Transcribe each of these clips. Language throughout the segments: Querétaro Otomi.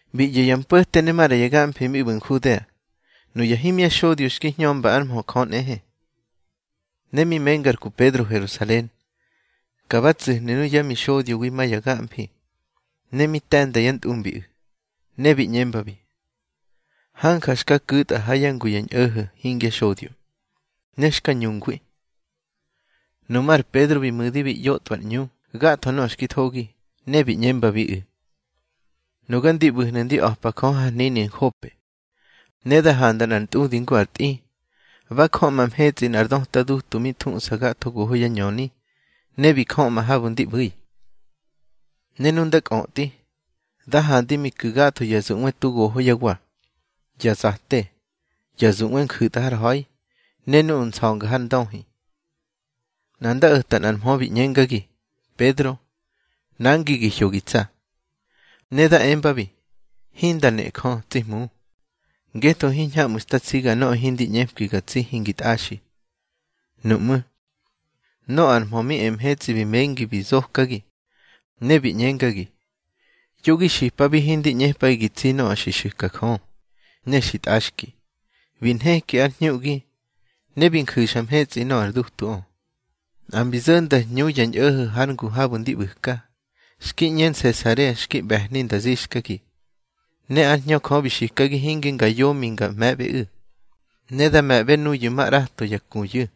Bi ꞌyo̱ ya mpo̱te ne maꞌra ya gamfi mi ꞌbu̱ Nhudea, nuya himya xodyo xki hñömba ár mhö Jö nꞌehe. Ne mi menga ar ku Pedro Herusalen, ka ba tsu̱hnu̱ nuyá mixodyowi ma ya gamfi ne mi te̱nda yá ntꞌumbiꞌu̱. Ne bi ꞌñembabi: —Hanja xka ku̱tꞌa ha yá ngu ya ñꞌo̱ho̱ hingya xodyo, ne xka ñungwi. Nuꞌmú̱ ar Pedro bi mu̱di bi ꞌyotꞌwa ar ꞌñu gatho nöꞌö xki thogi, ne bi ꞌñembabiꞌu̱: —Nuga ndi ꞌbu̱hnu̱ ndi a̱pa Jö har hnini Nhope, ne da handa nꞌar ntꞌudi ngu ar tꞌi. Ba jöꞌma mhetsꞌi nꞌar döta dutu mi thuꞌsa gatho goho yá ñöni, ne bi jöꞌma habu̱ ndi ꞌbu̱i. Ne nu nda kꞌötꞌi, da handi mi ku̱ gatho ya zuꞌwe tu goho yá wa, ya zate, ya zuꞌwe nju̱tꞌa har ha̱i, ne nuꞌu̱ nsa̱nga har ndöhi. Nꞌa nda o̱ta nꞌar mhö bi ꞌñengagi: Pedro, nangi gi hyo gi tsa. Ne da embabi: Hinda nejö, tsi Hmu, ngetho hiñhamꞌu̱ xta tsiga nöꞌö hindi ꞌñepki ga tsi hingi tꞌaxi. Nuꞌmú̱, nöꞌö ar mhö mi e mhetsꞌi bi mengi bi zokagi, ne bi ꞌñengagi: Yo gi xipabi hindi ꞌñepꞌaꞌi gi tsi nöꞌö xi xu̱ka Jö, ne xi tꞌaxki. Bi nheki ar hñuꞌgi, ne bi nju̱xa mhetsꞌi nöꞌö ar dutuꞌö. Nꞌa mbi zo̱nda hñu ya ñꞌo̱ho̱ har ngu habu̱ ndi ꞌbu̱ka, xki ꞌñe Nsesarea xki ꞌbe̱hni nda zixkagi. Ne ár Hñö Jö bi xikagi hinge nga yomi nga me̱ꞌbeꞌu̱. Ne da me̱ꞌbe nuyu̱ ma ꞌrato ya kuyu̱.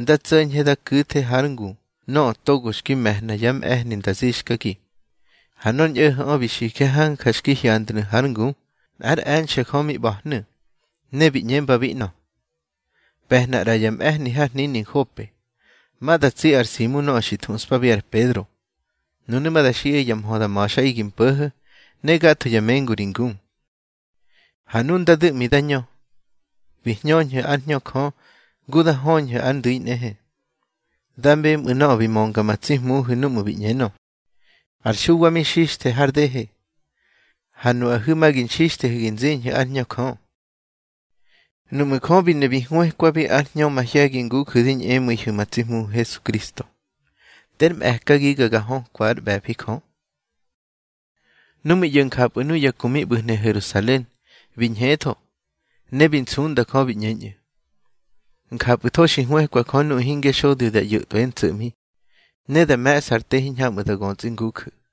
Nda tso̱ñhe da ku̱the hár ngu nöꞌö togo xki me̱hna yá mꞌe̱hni nda zixkagi. Ha nor ñꞌo̱ho̱ꞌö bi xije hanja xki hyandnu̱ hár ngu nꞌár e̱nxe̱ Jö mi ꞌba̱hnu̱, ne bi ꞌñembabi ꞌnö: Pe̱hna ꞌra ya mꞌe̱hni har hnini Nhope, ma da tsi ar Simu nöꞌö xi thuꞌspabi ar Pedro. Nunu̱ ma da xiꞌaꞌi ya mhö da ma̱xꞌaꞌi gi mpo̱ho̱, ne gatho ya mengu ri ngu. Ha nu nda du̱ꞌmi da ñö, bi hñöñꞌu̱ ár Hñö Jö ngu da höñhu̱ ar ndu̱i nꞌehe. Da bemꞌu̱ nöꞌö xki mönga ma tsi Hmuhu̱ núꞌmu̱ bi ꞌñenö: Ar Xuwa mi xixthe har dehe, ha nuꞌahu̱ ma gi nxixthehu̱ gi nziñhu̱ ár Hñö Jö. Nuꞌmu̱ Jö bi ne bi hwëkwabi ár Hñö mahye̱gi nguju̱ di ñꞌemu̱ihu̱ ma tsi Hmuhu̱ Hesukristo, ter mꞌe̱kagiga ga hökwa ár ꞌbe̱fi Jö. Nu mi ꞌyo̱ njapꞌu̱ nuya ku mi ꞌbu̱hnu̱ Herusalen, bi ñhetho, ne bi nsunda Jö, bi ꞌñeñꞌu̱: —Njapꞌu̱tho xi hwëkwa Jö nuꞌu̱ hingya xodyo da ꞌyo̱tꞌwár ntso̱ꞌmi, ne da me̱ꞌsa ar te hiñhamꞌu̱ da götsꞌi nguju̱.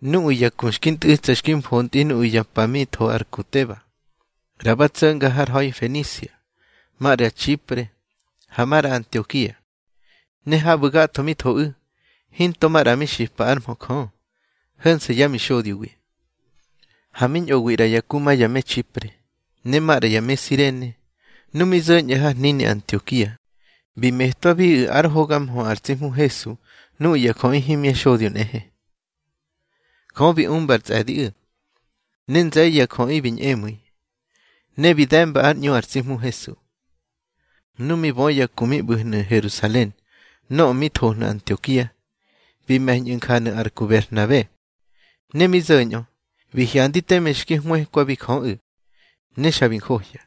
Nuꞌu̱ ya ku xki ntꞌu̱tsa xki mfontꞌi nuꞌu̱ ya pa mi tho ar ku Teba, ꞌra ba tso̱nga har ha̱i Fenisia, maꞌra Txipre, ha maꞌra Antiokia. Ne habu̱ gatho mi thoꞌu̱, hinto maꞌra mi xipa ár mhö Jö, ho̱nse̱ yá mixodyowi. Ha mi ñꞌowi ꞌra ya ku ma ya me Txipre, ne maꞌra ya me Sirene. Nu mi zo̱ñꞌu̱ har hnini Antiokia, bi metwabiꞌu̱ ár hoga mhö ar tsi Hmu Hesu nuꞌu̱ ya jöꞌi himya xodyo nꞌehe. Jö bi umba ar tsꞌe̱diꞌu̱, ne nze̱ye̱ ya jöꞌi bi ñꞌemu̱i, ne bi de̱mba ár ꞌñu ar tsi Hmu Hesu. Nu mi bö ya ku mi ꞌbu̱hnu̱ Herusalen nöꞌö mi thohnu̱ Antiokia, bi me̱ñꞌu̱ injanu̱ ar ku Berhnabe. Ne mi zo̱ñꞌö, bi hyandi teme xki hwëkwabi Jöꞌu̱, ne xa bi njohya.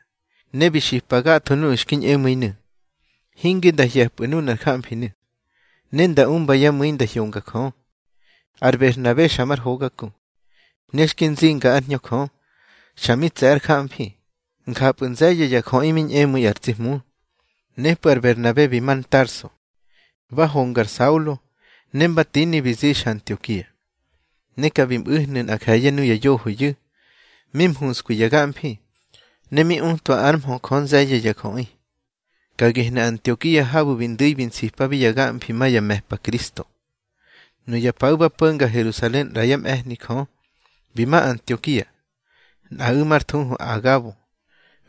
Ne bi xipa gatho nuꞌu̱ xki ñꞌemu̱inu̱, hinge nda hye̱pꞌu̱ nunar jamfinu̱, ne nda umba yá mu̱i nda hyonga Jö. Ar Berhnabe xa mar hoga ku, ne xki nzinga ár Hñö Jö, xa mi tse̱ ár jamfi. Njapꞌu̱ nze̱ye̱ ya jöꞌi bi ñꞌemu̱i ar tsi Hmu. Nepꞌu̱ ar Berhnabe bi ma Tarso, ba honga ar Saulo, ne mba tini bi zixa Antiokia. Ne ka bi mꞌu̱hnu̱ nꞌa nje̱ye̱ nuya yohoyu̱, mi mhunskwi ya gamfi, ne mi utwa ár mhö Jö nze̱ye̱ ya jöꞌi. Ka gehnu̱ Antiokia habu̱ bi ndu̱i bi nsipabi ya gamfi ma ya me̱pa Kristo. Nuya paꞌu̱ ba po̱nga Herusalen ꞌra yá mꞌe̱hni Jö, bi ma Antiokia. Nꞌaꞌu̱ már thuhu ar Agabo,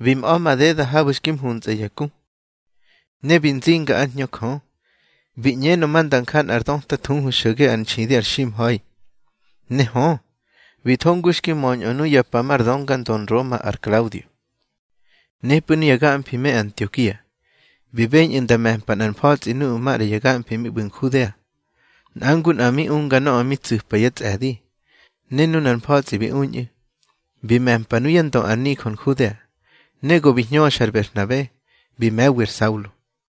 bi mꞌa̱ madeda habu̱ xki mhuntsꞌa ya ku. Ne bi nzinga ár Hñö Jö, bi ꞌñenö ma nda nja nꞌar döta thuhu xo̱ge ár nxidi ar ximha̱i. Ne hö, bi tho ngu xki möñꞌö nuya pa mar dönga ndö Nroma ar Klaudio. Nepꞌu̱ nuya gamfi me Antiokia bi beñꞌu̱ nda me̱mpa nꞌar mfa̱tsꞌi nuꞌu̱ maꞌra ya gamfi mi ꞌbu̱hnu̱ Nhudea. Nꞌa ngu nꞌa bi unga nöꞌö mi tsu̱pa yá tsꞌe̱di. Ne nunar mfa̱tsꞌi bi uñꞌu̱, bi me̱mpa nuyá ndö ar nijö Nhudea, ne go bi hñöxa ar Berhnabe, bi me̱wi ar Saulo.